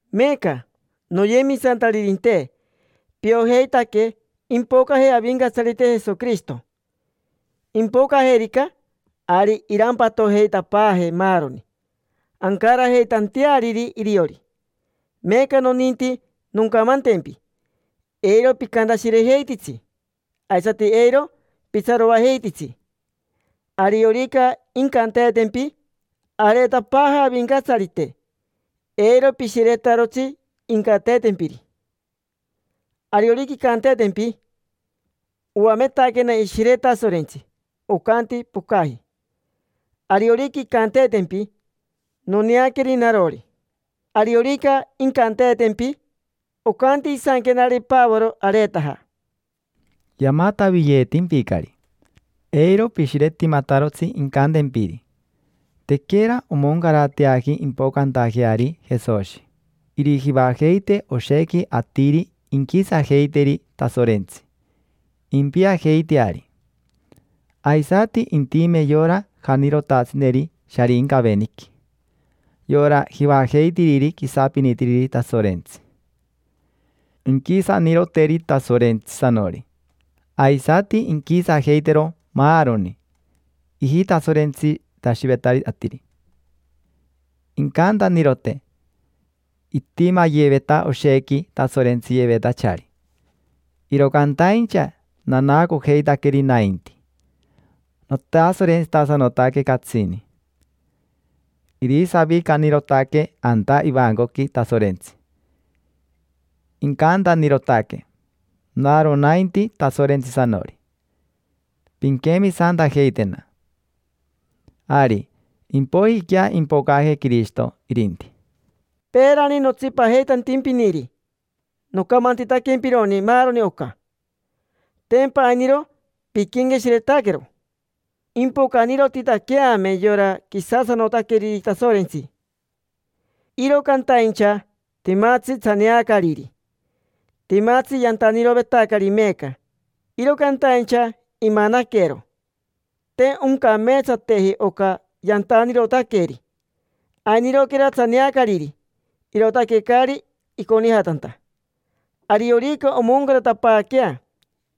Meeca, noyemisantaririnte, piojeitaque impocaje Avincatsarite Jesoquirishito. Impocajerica, ari irampatojeitapaajee maaroni, ancarajeitanteariri iriori. Meeca noninti noncamantempi: eiro picantashirejeititsi, aisati eiro pitsaroajeititsi. Ariorica incanteetempi: “Areetapaaja Avincatsarite”, eiro pishiretarotsi incanteetempiri. Ariorica incanteetempi: “Oametaquena Ishire Tasorentsi, ocanti pocaji”. Ariorica incanteetempi: “Noneaqueri narori”. Ariorica incanteetempi: “Ocanti isanquenare Pavoro areetaja”. Yamataviyeetimpicari. Eiro pishiretimatarotsi incantempiri. Tequera omoncarateaji impocantajeari Jesoshi. Irijivajeite oshequi atiri inquisajeiteri Tasorentsi, impiajeiteari. Aisati intime yora janirotatsineri Sharincaveniqui, yora jivajeitiriri quisapinitiriri Tasorentsi. Inquisaniroteri Tasorentsisanori, aisati inquisajeitero maaroni ijitasorentsitashivetari atiri. Incantanirote: “Itimayeveta oshequi tasorentsiyevetachari, iro cantaincha nanaacojeitaqueri nainti. Notasorentsitasanotaque catsini”. Irisavicanirotaque anta ivancoqui Tasorentsi, incantanirotaque: “Naro nainti Tasorentsisanori, pinquemisantajeitena”. Ari, impoijiquea impocaje Quirishito, irinti. Peerani notsipajeitantimpiniri, nocamantitaquempironi maaroni oca. Tempa ainiro piquenqueshiretaquero. Impocanirotitaqueame yora quisasanotaqueriri Tasorentsi, iro cantaincha timatsi tsaneacariri. Timatsi yantanirovetacari meeca, iro cantaincha imanaquero. Te oncameetsateji oca yantanirotaqueri. Ainiroquera tsaneacariri, irootaque caari iconijatanta. Ariorica omoncaratapaaquea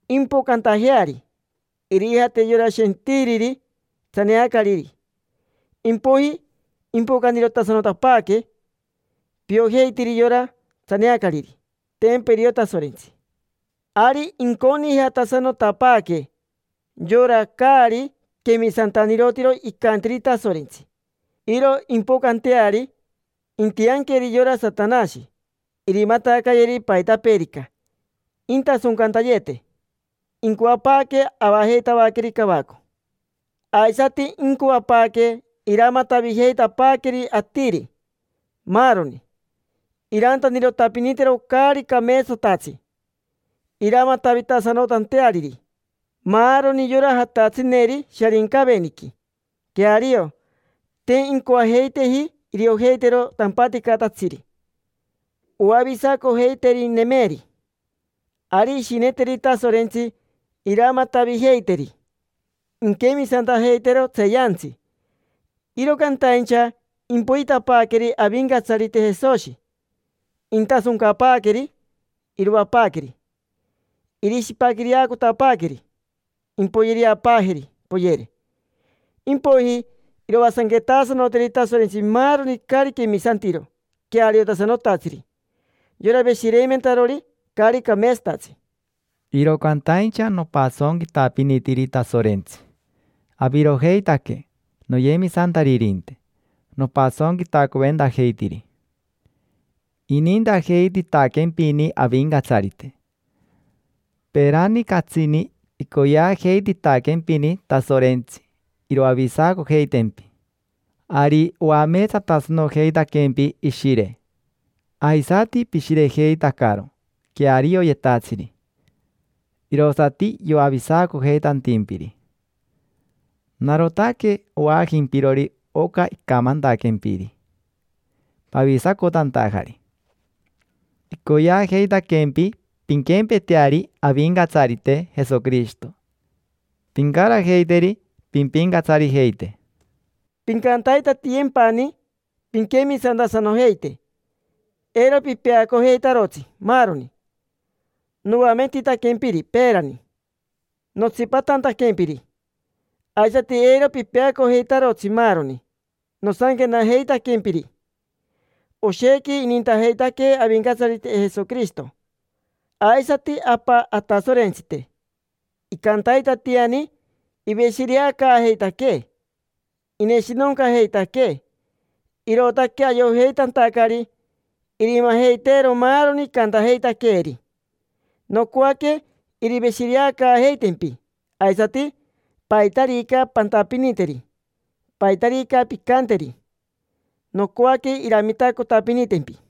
impocantajeari, irijate yora shentiriri tsaneacariri, impoiji impocanirotasanotapaaque. Piojeitiri yora tsaneacariri: tempa irio Tasorentsi. Ari inconijatasanotapaaque yora caari quemisantanirotiro icantiri Tasorentsi. Iro impocanteari intianqueri yora Satanashi. Irimatacayeri paitapeerica, intasoncantayete: incoapaaque avajeitavaqueri cavaco. Aisati incoapaaque iramatavijeitapaaqueri atiri, maaroni. Irantanirotapinitero caari cameetsatatsi, iramatavitasanotanteariri maaroni yora jatatsineri Sharincaveniqui: queario, te incoajeiteji iriojeitero tampaticatatsiri oavisacojeiterinemeri. Ari irishineteri Tasorentsi iramatavijeiteri, inquemisantajeitero tseeyantsi. Iro cantaincha impoitapaaqueri Avincatsarite Jesoshi, intasoncapaaqueri, iroapaaqueri. Irishipaquireacotapaaqueri, impoyereapaajeri, poyere. Impoiji iroasanquetaasanoteri Tasorentsi maaroni caari quemisantiro queariotasanotatsiri: yora veshireimentarori caari cameetsatatsi. Iro cantaincha nopasonquitapinitiri Tasorentsi. Avirojeitaque, noyemisantaririnte, nopasonquitacoventajeitiri. Inintajeititaquempini Avincatsarite. Peerani catsini icoyeajeititaquempini Tasorentsi iroavisacojeitempi. Ari oameetsatasanojeitaquempi Ishire, aisati pishirejeitacaro quearioyetatsiri, irosati yoavisacojeitantimpiri. Narotaque ovaajimpirori oca icamantaquempiri pavisacotantajari. Icoyeajeitaquempi pinquempeteari Avincatsarite Jesoquirishito, pincarajeiteri pimpincatsarijeite. Pincantaitatiyempani pinquemisantasanojeite. Eiro pipeacojeitarotsi maaroni noametitaquempiri peerani notsipatantaquempiri. Aisati eiro pipeacojeitarotsi maaroni nosanquenajeitaquempiri. Oshequi inintajeitaquee Avincatsarite Jesoquirishito, aisati Apa Atasorentsite. Icantaitatiani iveshireacaajeitaquee. Ineshinoncajeitaquee, irootaque ayojeitantacari irimajeiteero maaroni icantajeitaqueeri. Nocoaque iriveshireacaajeitempi. Aisati, paitarica pantapiniteri, paitarica pincanteri, nocoaque iramitacotapinitempi.